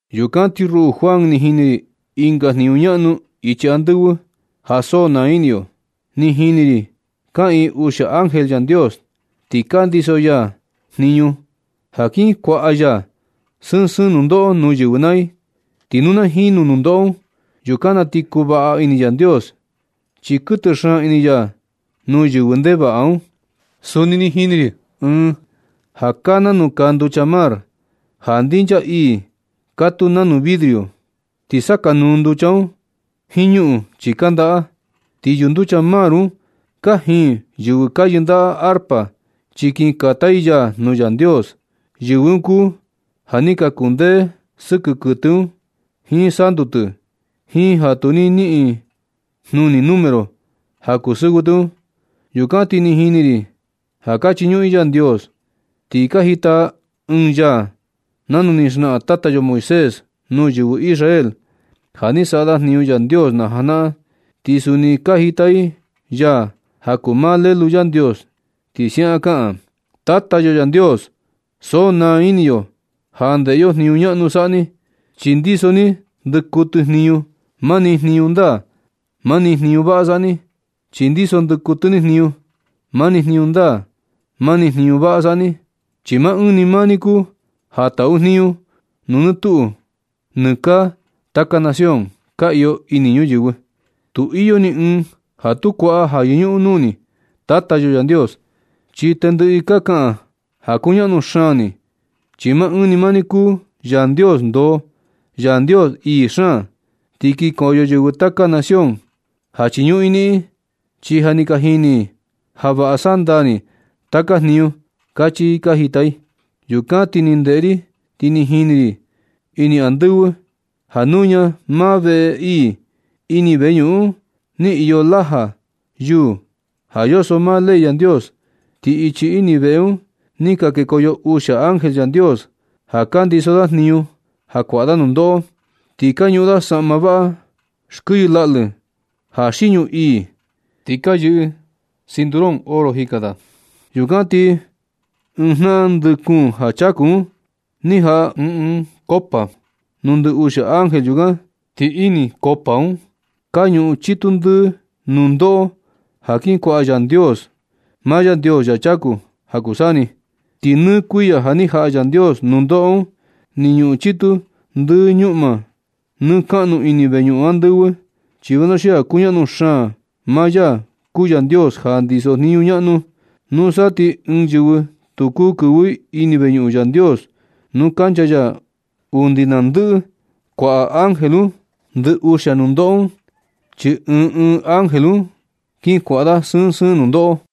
Yukan ti ruꞌu Juan, ni jini ri ɨnga jniñu ñaꞌnu ichi andɨvɨ ja so naa ini yo. Ni jini ri kaꞌiin uxia ángel Yandios, ti ka ndiso ya jniñu ja kin kuaꞌa ya sɨɨn sɨɨn nundoꞌo nuu yɨvɨ naa ti, ti nu na jinu nundoꞌo un, yukan na ti kuu vaꞌa ini Yandios, chi kuɨtɨ xaan ini ya nuu yɨvɨ ndevaꞌa un. Suni ni jini ri ɨɨn ja kaa nanu kaa nducha mar, ja ndinchaa ii katuu nanu vidrio. Ti sakanuu nducha un jiin ñuꞌun chi kandaꞌa. Ti yunducha mar un kajin yɨvɨ ka yɨndaꞌa arpa chi kin kata i yaa nuu Yandios. Yɨvɨ un kuu ja ni ka kundee sɨkɨ kuɨtɨ un jiin santu tɨ, jiin ja tu ni niꞌin i jnuni número ja kuu sɨvɨ tɨ un. Yukan ti ni jini ri ja ka chiñuꞌun i Yandios ti ka jita i ɨɨn yaa nanu ni xnaꞌan tata yo Moisés nuu yɨvɨ Israel, ja ni saꞌa da jniñu Yandios najanaꞌan. Ti suni ni ka jita i yaa ja kuu maa Lelu Yandios, ti siaꞌan kaꞌan: Tata yo Yandios, so naa ini yo ja ndeꞌe yo jniñu ñaꞌnu saꞌa ni, chi ndiso ni ndɨkuɨtɨ jniñu. Mani jniñu ndaa, mani jniñu vaꞌa saꞌa ni. Chi ndiso ndɨkuɨtɨ ni jniñu. Mani jniñu ndaa, mani jniñu vaꞌa saꞌa ni, chi maa ɨɨn ni maa ni kuu ja taꞌu jniñu nuu nɨ tuꞌu nɨ kaa taka nación ka iyo ini ñuyɨvɨ. Tu iyo ni ɨɨn ja tu kuaꞌa ja yɨñuꞌun nuu ni, Tata yo Yandios. Chi tendɨꞌɨ i ka kaꞌan ja kuñaꞌnu xaan ni. Chi maa ɨɨn ni maa ni kuu Yandios ndoo, Yandios ii xaan. Ti kinkoyo yɨvɨ taka nación ja chiñuꞌun i niꞌin. Chi ja ni ka jini i ja vaꞌa saꞌa ndaa ni taka jniñu. Kachi i ka jita i. Yukan ti ni ndeꞌe ri, ti ni jini ri ini andɨvɨ ja nuña maa veꞌe ii ini veñuꞌun nuu iyo laja yuu ja yoso maa ley Yandios. Ti ichi ini veꞌe un ni ka kekoyo uxia ángel Yandios ja ka ndiso da jniñu ja kuaꞌa da nundoꞌo. Ti ka ñuꞌun da saꞌma vaꞌa xkɨyɨ laꞌlɨ ja xiñu ii, ti ka nuꞌni ɨɨn cinturón oro jika da. Yukan ti ɨɨn jnaꞌan ndɨ kuun ja chaku un ni jaꞌa ɨɨn ɨɨn koꞌo nuu ndɨ uxia ángel yukan. Ti ini koꞌo un ka ñuꞌun chitu ndɨ nundoꞌo ja kin kuaꞌa Yandios, maa Yandios ya chaku ja kuu saa ni. Ti nɨ kuiya ja ni jaꞌa Yandios ndoꞌo un, ni ñuꞌun chitu ndɨ ñuꞌma nɨ kaꞌnu ini veñuꞌun andɨvɨ, chi vanuxia kuñaꞌnu xaan maa ya kuu Yandios ja ndisojniñu ñaꞌnu. Nusa ti ni ɨɨn yɨvɨ tu kuu kɨvɨ i ini veñuꞌun Yandios nuu kancha ya undi na ndɨꞌɨ kuaꞌa ángel un ndɨ uxia nundoꞌo un. Chi ɨɨn ɨɨn ángel un kin kuaꞌa da sɨɨn sɨɨn nundoꞌo.